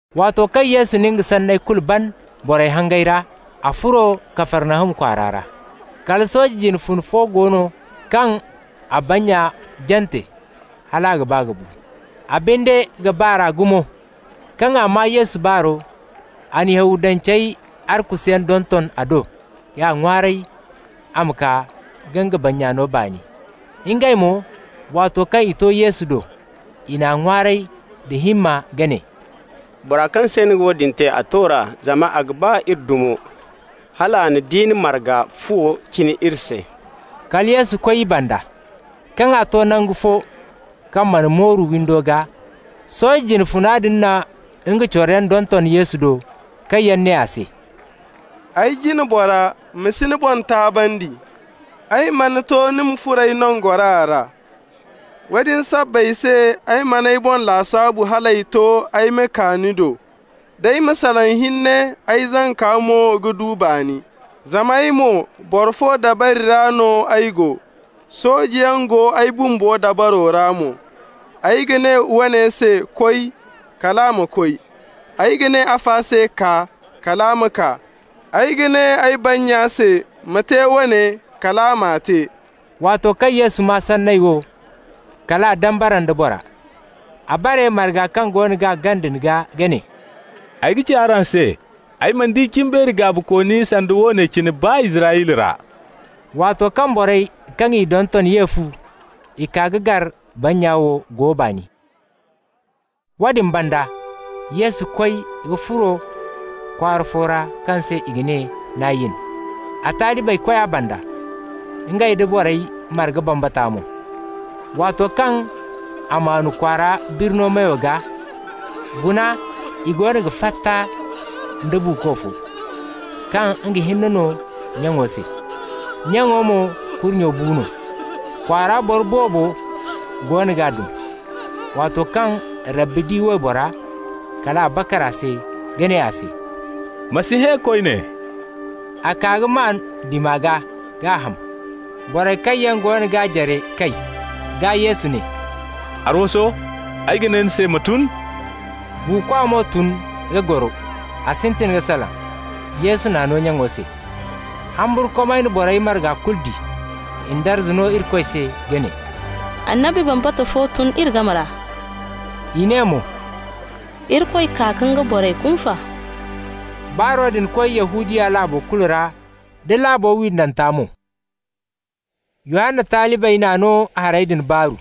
Waato kaŋ Yesu na nga sanney kulu ban borey hangey ra, a furo Kafarnahum kwaara ra. Kala sooje jine funa fo go no kaŋ a bannya jante hal a ga ba ka bu. A binde ga ba r'a gumo. Kaŋ a maa Yesu baaro, a na Yahudance arkusuyaŋ donton a do k'a ŋwaaray a ma kaa ka nga bannya no baani. Ngey mo, waato kaŋ i to Yesu do, i n'a ŋwaaray da himma ka ne: «Bora kaŋ se ni ga woodin te, a to r'a, zama a ga ba iri dumo, hal a na diina marga fuwo cina iri se.» Kala Yesu koy i banda. Kaŋ a to nangu fo kaŋ mana mooru windo gaa, sooje jine funa din na nga coroyaŋ donton Yesu do kaŋ yaŋ ne a se: «Ay jina bora, ma si ni boŋ taabandi. Ay mana to ni ma furo ay nangora ra. Woodin sabbay se ay man'ay boŋ lasaabu hal ay to ay ma kaa ni do. Day, ma salaŋ hinne, ay zanka mo ga du baani. Zama ay mo, boro fo dabari ra no ay go, soojeyaŋ go ay bumbo dabaro ra mo. Ay ga ne woone se: ‹Koy!› -- kal a ma koy. Ay ga ne afa se: ‹Kaa!› -- kal a ma kaa. Ay ga ne ay bannya se: ‹Ma te woone!› -- kal a m'a te.» Waato kaŋ Yesu maa sanney wo, kal a dambara nda bora. A bare marga kaŋ goono g'a gana din gaa ka ne: «Ay ga ci araŋ se: ay mana di cimbeeri gaabikooni sanda woone cine, baa Israyla ra.» Waato kaŋ borey kaŋ i donton ye fu, i kaa ka gar bannya wo go baani. Woodin banda, Yesu koy ka furo kwaara fo ra kaŋ se i ga ne Nayin. A talibey koy a banda, ngey nda borey marga bambata mo. Waato kaŋ a maanu kwaara birno meyo gaa, guna i goono ga fatta nda buuko fo, kaŋ nga hinne no nyaŋo se, nyaŋo mo kurnyo bu no. Kwaara boro boobo goono g'a dum. Waato kaŋ Rabbi di waybora, kal a bakar a se ka ne a se: «Ma si hẽ koyne.» A kaa ka maan dima gaa k'a ham. Borey kaŋ yaŋ goono g'a jare kay. Gaa Yesu ne: «Arwaso, ay ga ne ni se: ma tun.» Buukwa mo tun ka goro, a sintin ka salaŋ. Yesu n'a no nyaŋo se. Humburkumay na borey marga kulu di. I na darza no Irikoy se ka ne: «Annabi bambata fo tun iri game ra!» I ne mo: «Irikoy kaa ka nga borey kunfa!» Baaro din koy Yahudiya laabo kulu ra, da laabu windanta mo. Yohanna talibey n'a no hayey din baaru.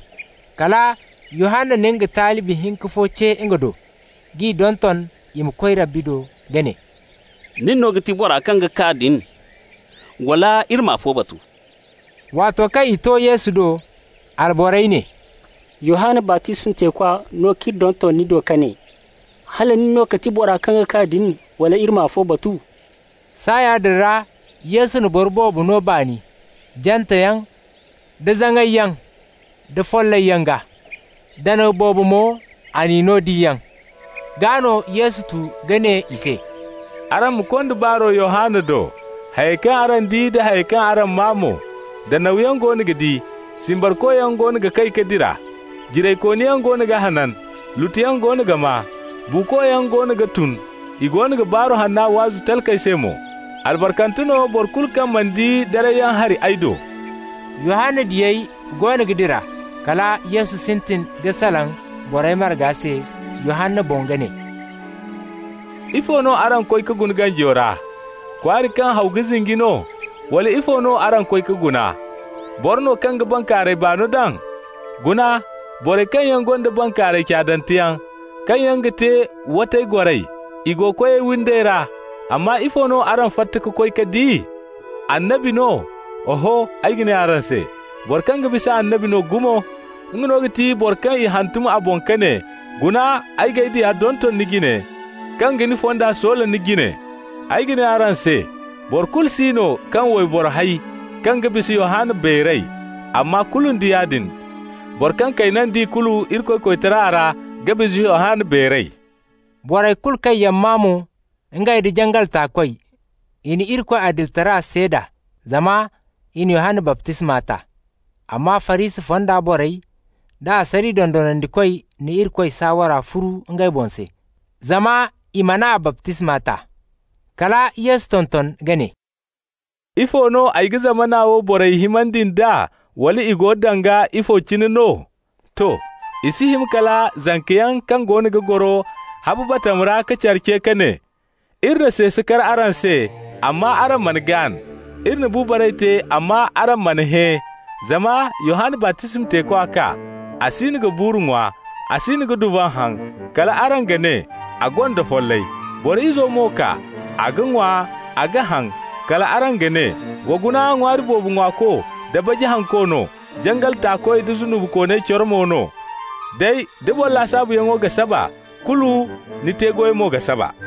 Kala Yohanna na nga talibi hinka fo ce nga do, k'i donton i ma koy Rabbi do ka ne: «Nin no ga ti boro kaŋ ga kaa din, wala iri ma afo batu?» Waato kaŋ i to Yesu do, alborey ne: «Yohanna baptisma teekwa no k'iri donton ni do ka ne: ‹Hala nin no ga ti boro kaŋ ga kaa din, wala iri ma afo batu?›» Saaya din ra Yesu na boro boobo no baani janteyaŋ, da zaŋayyaŋ, da follayyaŋ gaa. Danaw boobo mo, a n'i no diyaŋ. Gaa no Yesu tu ka ne i se: «Araŋ ma konda baaro Yohanna do, hayey kaŋ araŋ di da hayey kaŋ araŋ maa mo: danawyaŋ goono ga di, simbarkoyaŋ goono ga kay ka dira, jiraykooniyaŋ goono ga hanan, lutuyaŋ goono ga maa, buukoyaŋ goono ga tun, i goono ga Baaru Hanna waazu talkey se mo. Albarkante no boro kulu kaŋ mana di darayyaŋ hari ay do.» Yohanna diyey goono ga dira, kala Yesu sintin ka salaŋ borey marga se Yohanna boŋ ka ne: «Ifo no araŋ koy ka guna ganjo ra? Kwaari kaŋ haw ga zinji no? Wala ifo no araŋ koy ka guna? Boro no kaŋ ga bankaaray baano daŋ? Guna, borey kaŋ yaŋ gonda bankaaray caadanteyaŋ, kaŋ yaŋ ga te watay goray, i go koyey windey ra. Amma ifo no araŋ fatta ka koy ka di? Annabi no? Oho, ay ga ne araŋ se, boro kaŋ ga bisa annabi no gumo! Nga no ga ti boro kaŋ i hantum a boŋ ka ne: ‹Guna, ay g'ay diya donton ni jine, kaŋ ga ni fonda soola ni jine.› Ay ga ne araŋ se: boro kulu si no kaŋ wayboro hay kaŋ ga bisa Yohanna beeray. Amma kulu nda yaadin, boro kaŋ kayna da ikulu Irikoy koytara ra ga bisa Yohanna beeray.» Borey kulu kaŋ yaŋ maa mo, ngey nda jangal taakoy, i na Irikoy adilitara seeda, zama i na Yohanna baptisma ta. Amma Farisi fonda borey da asariya dondonandikoy na Irikoy saawara furu ngey boŋ se, zama i man'a baptisma ta. Kala Yesu tonton ka ne: «Ifo no ay ga zamana wo borey himandi nd'a, wala i go danga ifo cine no? To, i si hima kala zankayaŋ kaŋ goono ga goro habu batama ra ka care ce ka ne: ‹Iri na seese kar araŋ se, amma araŋ mana gaan. Iri na bu baray te amma araŋ mana hẽ.› Zama Yohanna baptisma teekwa kaa, a siino ga buuru ŋwa, a siino ga duvan haŋ. Kal araŋ ga ne: ‹A gonda follay.› Boro Izo mo kaa, a ga ŋwa, a ga haŋ. Kal araŋ ga ne: ‹Wa guna ŋwaari boobo ŋwaako da baji hanko no, jangal taakoy da zunubikooney coro mo no.› Day, da boro lasaabuyaŋo ga saba, kulu ni te-goy mo ga saba!»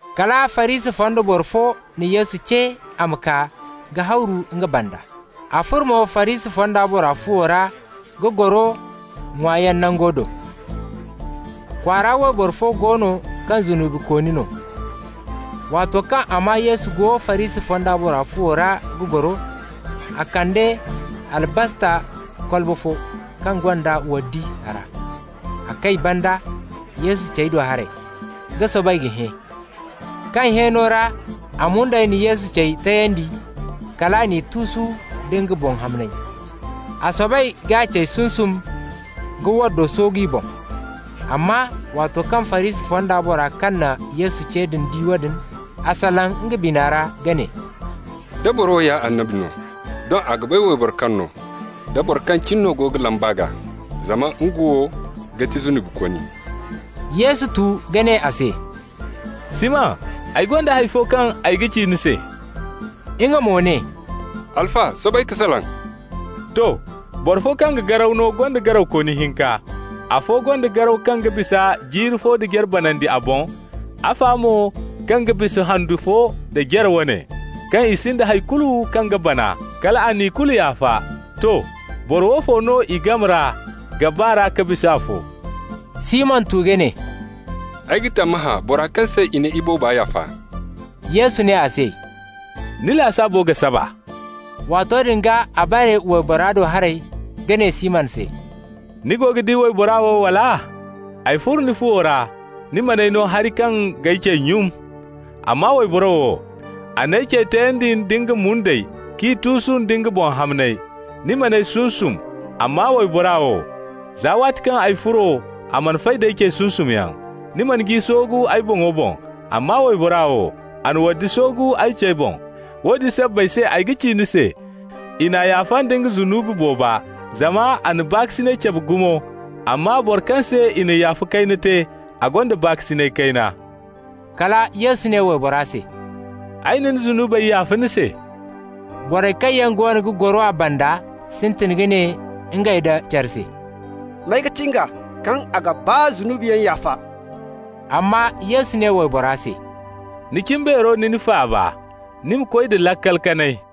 Kala Farisi fonda boro fo na Yesu ce a ma kaa ka hawru nga banda. A furo mo Farisi fonda bora fuwo ra ka goro ŋwaayaŋ nango do. Kwaara wayboro fo go no kaŋ zunubikooni no. Waato kaŋ a maa Yesu go Farisi fonda bora fuwo ra ga goro, a kande albasta kolba fo kaŋ gonda waddi a ra. A kay banda, Yesu cey do haray, ka soobay ka hẽ. Kaŋ hẽeno ra a mundey na Yesu cey tayandi, kal a n'i tuusu nda nga boŋ hamney. A soobay k'a cey sunsum ka waddo soogu i boŋ. Amma waato kaŋ Farisi fonda bora kaŋ na Yesu ce din di woodin, a salaŋ nga bina ra ka ne: «Da boro wo ya annabi no, doŋ a ga bay wayboro kaŋ no, da boro kaŋ cine no go ga lamb'a gaa, zama nga wo ga ti zunubikooni.» Yesu tu ka ne a se: «Siman, ay gonda hay fo kaŋ ay ga ci ni se.» Nga mo ne: «Alfa, soobay ka salaŋ.» «To. Boro fo kaŋ ga garaw no gonda garawkooni hinka. Afo gonda garaw kaŋ ga bisa jiiri fo da jare banandi a boŋ, afa mo wo kaŋ ga bisa handu fo da jare wane. Kaŋ i sinda hay kulu kaŋ ga bana, kal a na ikulu yaafa. To. Boro woofo no i game ra ga ba r'a ka bisa afo?» Siman tu ka ne: «Ay ga tammahã bora kaŋ se i na ibooba yaafa.» Yesu ne a se: «Ni lasaabo ga saba.» Waato din gaa a bare waybora do haray ka ne Siman se: «Ni go ga di wayboro wo, wala? Ay furo ni fuwo ra, ni man'ay no hari kaŋ g'ay cey nyun. Amma wayboro wo, a n'ay cey tayandi nda nga mundey k'i tuusu nda nga boŋ hamney. Ni man'ay sunsum, amma wayboro wo, za waati kaŋ ay furo, a mana fay d'ay cey sunsumyaŋ. Ni mana ji soogu ay boŋo boŋ, amma wayboro wo, a na waddi soogu ay cey boŋ. Woodin sabbay se ay ga ci ni se, i n'a yaafa nda nga zunubi booba, zama a na baakasinay cabe gumo. Amma bora kaŋ se i na yaafa kayna te, a gonda baakasinay kayna.» Kala Yesu ne waybora se: «Ay na ni zunubey yaafa ni se.» Borey kaŋ yaŋ goono ga goro a banda sintin ka ne ngey nda care se: «May ga ti nga, kaŋ a ga baa zunubiyaŋ yaafa?» Amma Yesu ne waybora se: «Ni cimbeero na ni faaba. Ni ma koy da laakal kanay.»